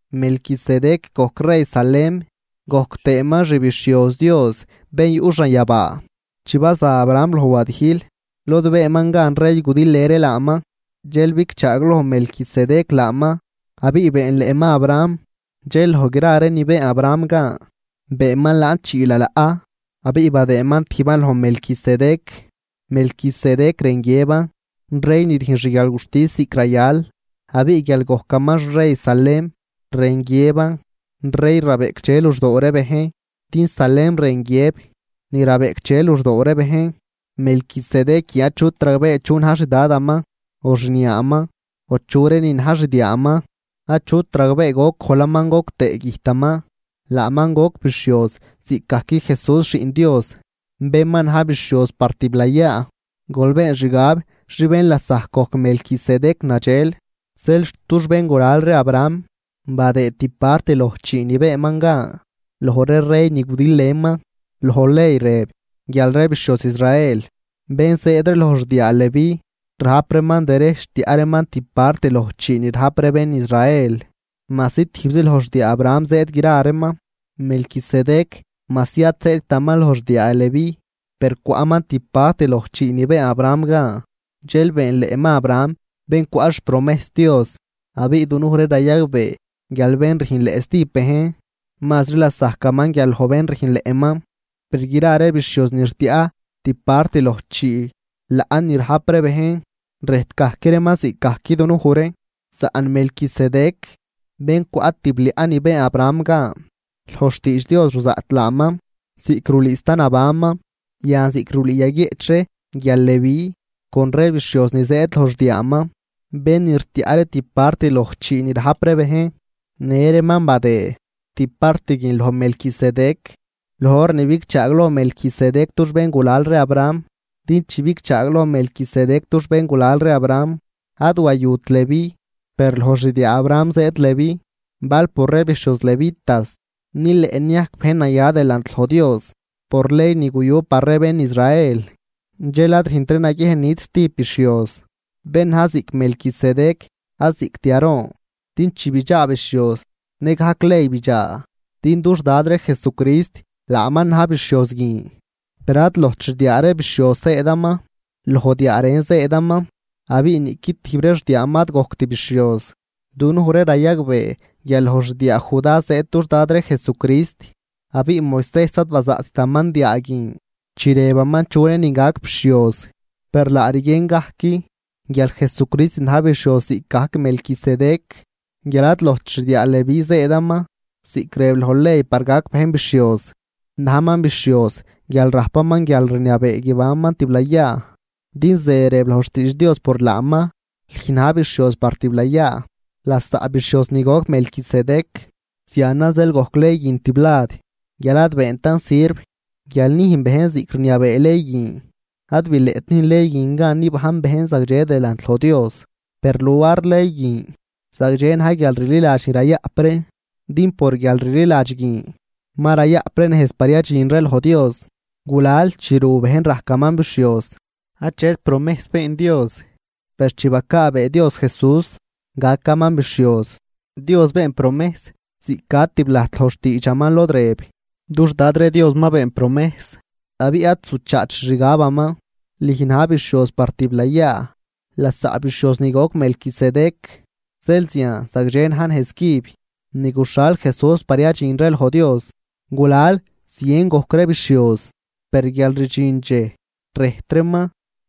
Melquisedec gojc rey Salem gojc tëëman xbixhioz Dios bén yuꞌ xanyabaa. Chi baza Abraham loj wadijl lod beenman gan rey gudilnë ree laaman, dxel bigchaagloj Melquisedec laaman, abiꞌ beenleꞌman Abraham. Dxel loj gra ree ni been Abraham gan, beenman laan chii lalaꞌ abiꞌ badëëman tijban loj Melquisedec. Melquisedec rën guiëban “rey ni rüjn xguialguxtis ziꞌc rayal”, Abiꞌ guial gojcaman xrey Salem rën guiëban “rey rabeꞌcdxe luxdoo ree bejn”, din Salem rën guiëb “ni rabeꞌcdxe luxdoo ree bejn”. Melquisedec guin achut ragbee chu na̱j xDadaman, o xniaaman o chu ree nin na̱j xdiaaman. Achut ragbee goc gojlaman goc tëë güjtaman. Laaman goc bixhioz ziꞌcgajc Jesús Xiꞌn Dios bén ma na̱j bixhioz par tiblayaa. Gol been xgab xi bén lasajc gojc Melquisedec nadxel. Zeel xt dux béngulal ree Abraham badëë tib part loj chii ni beenman gan loj ree rey ni gudilnëman. Loj ley rëb guial ree bixhioz Israel ni zëëd loj xdiaa Leví rajp reeman derejch tiaꞌ reeman tib part loj chii ni rajp ree bén Israel, majsi tijbzi loj xdiaa Abraham zëëd gra reeman. Melquisedec majsi ad zëëdtaman loj xdiaa Leví, per cwaꞌman tib part loj chii ni been Abraham gan. Dxel beenleꞌman Abraham bén cwaꞌ xpromejs Dios. Abiꞌ dunuj ree rayagbee guial bén rüjnleꞌ stijb bejn, mazri lasajcaman guial loj bén rüjnleꞌman. Per gra ree bixhioz ni rtiaꞌ tib part loj chii laꞌ ni rajp ree bejn, rëjt gajc reeman ziꞌcgajc dunuj ree. Saꞌn Melquisedec bén cwaꞌ tib liaꞌ ni been Abraham gan, loj xtiidx Dios ruzaꞌt laaman ziꞌc rulüü sta nabanman. Yan ziꞌc rulüü yaguieꞌch ree guial Leví con ree bixhioz ni zëëd loj xdiaaman bén ni rtiaꞌ ree tib part loj chii ni rajp ree bejn në reeman badëë tib part guin loj Melquisedec loj hor ni bigchaagloj Melquisedec dux béngulal ree Abraham. Din chi bigchaagloj Melquisedec dux béngulal ree Abraham, ad wayut Leví, per loj xdiaa Abraham zëëd Leví. Bal por ree bixhioz Levitas nileꞌ niajc bejn naya delant loj Dios por ley ni guyu par ree bén Israel, dxel ad rüjntri naguiejn niꞌt stijb bixhioz bén na̱j ziꞌc Melquisedec ad ziꞌct Aarón. Din chi bidxaa bixhioz nëgajc ley bidxaa, din dux Dad ree Jesucrist laaman na̱j bixhioz guin. Per ad lojt xdiaa ree bixhioz zëëdaman, loj diaa ren zëëdaman abiꞌ niꞌqui tijb ree xdiaaman ad gojct bixhioz. Dunuj ree rayagbee guial loj xdiaa Judá zëëd dux Dad ree Jesucrist abiꞌ Moisejs ad bazaꞌttaman diaa guin chi rëbaman chu reenin gac bixhioz. Per laa rguien gajc guial Jesucrist na̱j bixhioz ziꞌcgajc Melquisedec, guial ad lojt xdiaa Leví zëëdaman ziꞌc rëb loj ley par gac bejn bixhioz, najman bixhioz guial rajpaman guialrniabee guibanman tiblayaa. Din ze rëb loj xtiidx Dios por laaman: Lüj na̱j bixhioz par tiblayaa, lasaꞌ bixhioz ni goc Melquisedec. Zianan zeel gojc ley guin tiblad guial ad beentan sirv guial nüjn bejn ziꞌc rniabee ley guin. Ad bileꞌt nüjn ley guin gan nibajn bejn zagdxe delant loj Dios. Per luar ley guin zagdxe na̱j guialrliladx ni rayaꞌp ree din por guialrliladx guin ma rayaꞌp ree nejz par yadxin ree loj Dios. Gulal chi ru bejn rajcaman bixhioz, achet promejs been Dios, per chi bacaabee Dios Jesús gacaman bixhioz, Dios been promejs ziꞌc ca tiblajt loj xtiidxaman lod rëb: Dux Dad ree Dios ma been promejs abiꞌ ad zuchaat xixgabaman: “Lüj na̱j bixhioz par tiblayaa, lasaꞌ bixhioz ni goc Melquisedec.” Zeel zian zagdxe na̱j nejz cüb ni guxhal Jesús par yadxin ree loj Dios. Gulal zien gojc ree bixhioz per guial rdxin dxej rëjt reeman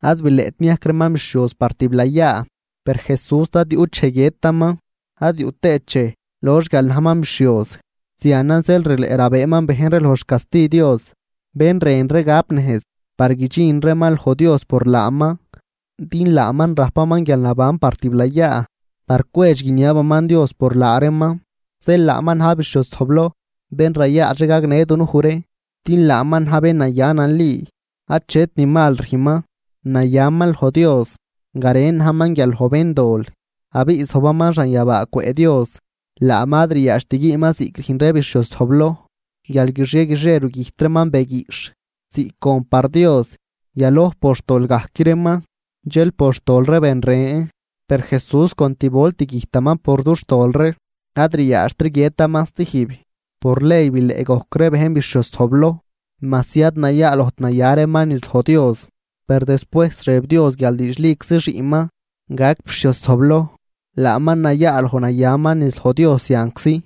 ad bileꞌt niajc reeman bixhioz par tiblayaa. Per Jesús ad yuꞌt dxej guiëtaman ad yuꞌ tëët dxej lox guial najman bixhioz. Zianan zeel rileꞌ rabëëman bejn ree loj xcasti Dios, bén rën ree gap nejz par guidxin reeman loj Dios por laaman, din laaman rajpaman guialnaban par tiblayaa par cwedx guiniabaman Dios por laa reeman. Zeel laaman na̱j bixhioz zojbloj bén rayaadx ree gagnë dunuj ree. Din laaman na̱j bén naya nali, achet ni mal rüjnman, nayaman loj Dios, garen najman guial loj béndol, abiꞌ zojbaman xanyabaa cwëꞌ Dios. Laaman ad ryadxt güünman ziꞌc rüjn ree bixhioz zojbloj guial guixie guixie rugüjt reeman be guiꞌxh ziꞌc gon par Dios. Yaloj por xtol gajc reeman dxel por xtol ree ben ren. Per Jesús con tib volt güjtaman por dux tol ree, ad ryaadxtri guiëtaman stijb. Por ley bileꞌ gojc ree bejn bixhioz zojbloj majsi ad nayaalojt naya reeman niz loj Dios. Per despuejs rëb Dios guial diidxliczi xiꞌnman gac bixhioz zojbloj, laaman nayaaloj nayaman niz loj Dios zianczi.